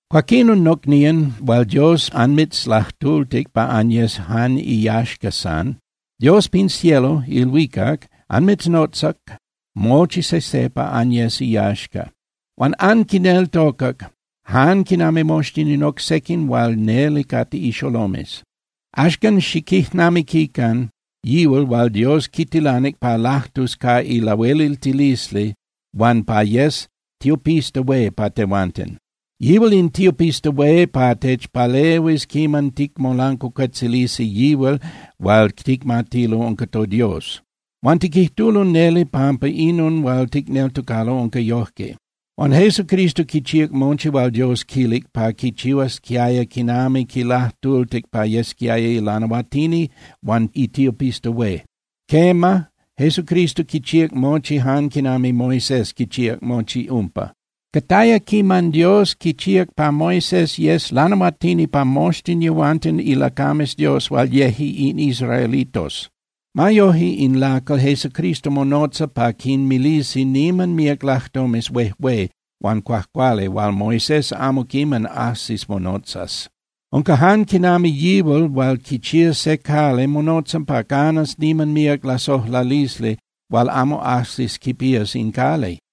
Cuaquinon, nocnían hual Dios anmitzlajtultic pa anyes jan iyaxca san, Dios pin cielo (ilhuicac) anmitznotzac mochi sejse pa anyes iyaxca. Huan anquineltocac, jan quinami moxtin in oc sequin hual neli cate ixolomes. Axcan, xiquijnamiquican yihual hual Dios quitilanic pa lajtus ca ilahueliltilisli huan pa yes tiopista hué pa tehuanten. Yihual in tiopista hué pa techpalehuis quiman ticmolancuacuetzilisi yihual hual ticmatilo unca toDios. Huan tiquijtulo neli pampa inon hual ticneltocalo unca yojque. Huan Jesucristo quichíac mochi hual Dios quilic pa quichihuasquiaya quiman quilajtultic pa yesquiaya ilanahuatini huan itiopista hué. Quema, Jesucristo quichíac mochi jan quinami Moisés quichíac mochi umpa. Cataya quiman Dios quichíac pa Moisés yes lanahuatini pa moxtin yehuanten ilacames Dios hual yeje in israelitos. Ma yoje in lacal Jesucristo monotza pa quinmilisi niman míac lajtomes huejué huan cuajcuali hual Moisés amo quiman ajsis monotzas. Unca jan quinami yihual hual quichía se cali monotza pa canas niman míac lasojlalisli hual amo ajsis quipías in cali.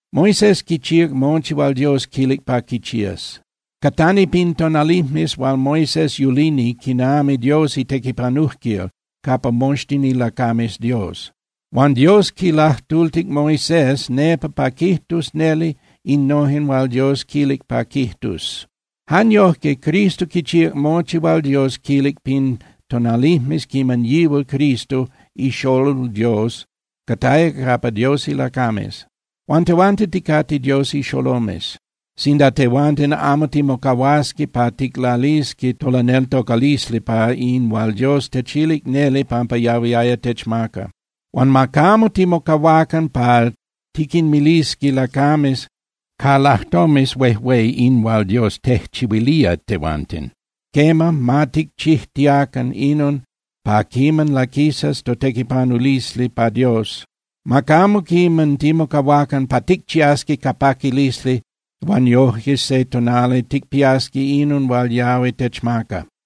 Moisés quichíac mochi hual Dios quilic pa quichías. Catani pin tonalijmes hual Moisés yulini quinami Dios itequipanujquil capa moxtin ilacames Dios. Huan Dios quilajtultic Moisés nepa pa quijtus neli innojen hual Dios quilic pa quijtus. Jan yojque Cristo quichíac mochi hual Dios quilic pin tonalijmes quiman yihual Cristo iXolol Dios cataya capa Dios ilacames. Huan tehuanten ticate Dios ixolomes, sinda tehuanten amo timocahuasqui pa ticlalisqui tolaneltocalisli pa in hual Dios techilía neli pampa yahui techmaca. Huan ma camo timocahuacan pa tiquinmilisqui lacames ca lajtomes huejué in hual Dios tejchihuilía tehuanten. Quema, ma ticchijtiacan inon pa quiman laquisas totequipanulisli pa Dios. Ma camo quiman timocahuacan pa ticchiasqui ca paquilisli huan yojque se tonali ticpiasqui inon hual yahui techmaca.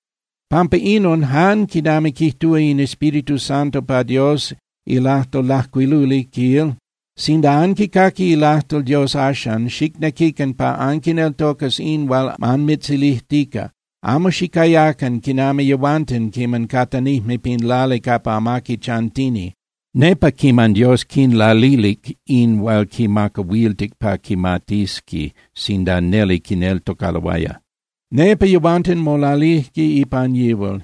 Pampa inon, jan quinami quijtúa in Espíritu Santo pa Dios ilajtol lajcuiluli, quil: Sinda anquicaqui ilajtol Dios axan, xicnequican pa anquineltocas in hual anmitzilijtica. Amo xicayacan quinami yehuanten quiman catanijme pin lali capa amaqui chantini, nepa quiman Dios quinlalilic in hual quimacahuiltic pa quimatisqui sinda neli quineltocaloaya. Nepa yehuanten molalijque ipan yihual,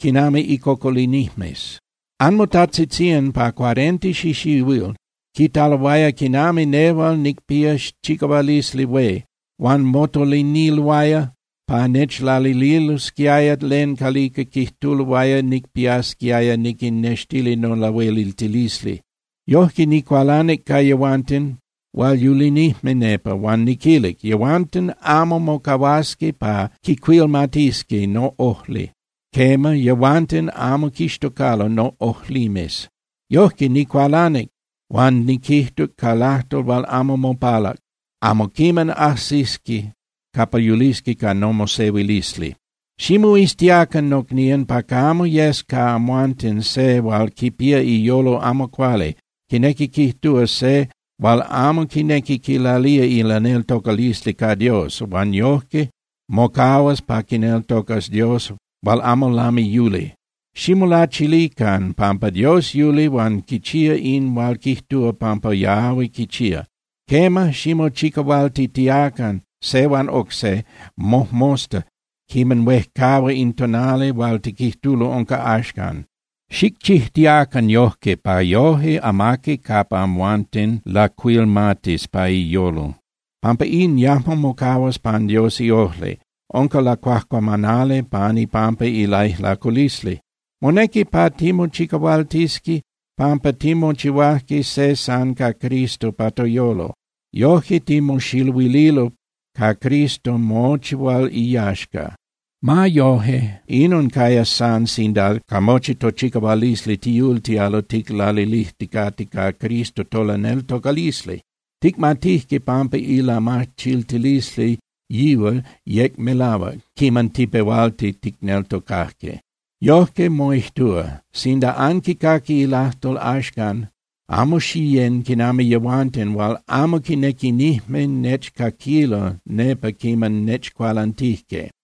quinami icocolinijmes. Anmotajtzitzían pa cuarenta xixihuil quitaloaya quinami nehual nicpía chicahualisli hué, huan motoliniloaya pa nechlalililosquiaya len calica quijtuloaya nicpiasquiaya niquinnextili nolahueliltilisli. Yojque, nicualanic ca yehuanten hual yulinijme nepa, huan niquilic: “Yehuanten amo mocahuasqui pa quicuilmatisqui noꞌojli, quema, yehuanten amo quixtocalo noꞌojlimes.” Yojque, nicualanic huan niquijtuc ca lajtol hual amo mopalac: “Amo quiman ajsisqui capa yulisqui ca nomosehuilisli.” Ximoiztiacan, nocnían, pa camo yes ca amhuanten se hual quipía iyolo amo cuali, quinequi quijtúa, se hual amo quinequi quilalía ilaneltocalisli ca Dios, huan yojque mocahuas pa quineltocas Dios hual amo lami yuli. Ximolachilican, pampa Dios yuli huan quichía in hual quijtúa pampa yahui quichía. Quema, ximochicahualtitiacan se huan oc se mojmosta quiman huejcahua in tonali hual tiquijtulo unca axcan. Xicchijtiacan yojque pa yoje amaqui capa amhuanten lacuilmatis pa iyolo. Pampa in yajmo mocahuas pan Dios iojli, unca lacuajcuamanali pan ipampa ilaijlaculisli. Monequi pa timochicahualtisqui, pampa timochihuajque se san ca Cristo pa toyolo. Yojque timoxiluililo ca Cristo mochi hual iyaxca. Ma yoje, inon cayas san sinda ca mochi tochicahualisli tiyultialo ticlalilijticate ca Cristo tolaneltocalisli. Ticmatijque pampa ilamachiltilisli yihual yec melahuac quiman tipehuajque ticneltocajque. Yojque moijtúa: Sinda anquicaqui ilajtol axcan, amo xiyén (xiyecan) quinami yehuanten hual amo quinequinijme nechcaquilo nepa quiman nechcualantijque.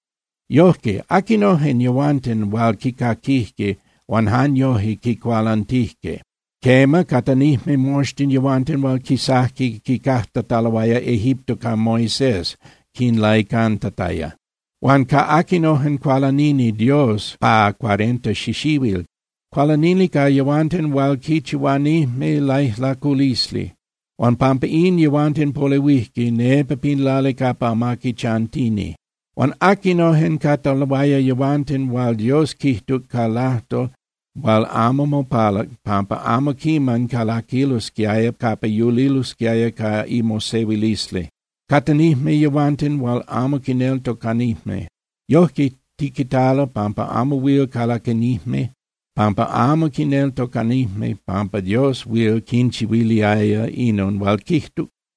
Yojque ¿aquinojen yehuanten hual quicaquijque, huan jan yojque quicualantijque? Quema, catanijme moxtin yehuanten hual quisajque quicajtataloaya Egipto ca Moisés quinlaicantataya. Huan ¿ca aquinojen cualanini Dios pa cuarenta xixihuil? Cualanini ca yehuanten hual quichihuanijme laijlaculisli, huan pampa in yehuanten polehuijque nepa pin lali capa amaqui chantini. Huan ¿aquinojen cataloaya yehuanten hual Dios quijtuc ca lajtol hual amo mopalac pampa amo quiman calaquilosquiaya capa yulilosquiaya ca imosehuilisli? Catanijme yehuanten hual amo quineltocanijme. Yojque tiquitalo pampa amo huil calaquinijme pampa amo quineltocanijme pampa Dios huil quinchihuiliaya inon hual quijtuc.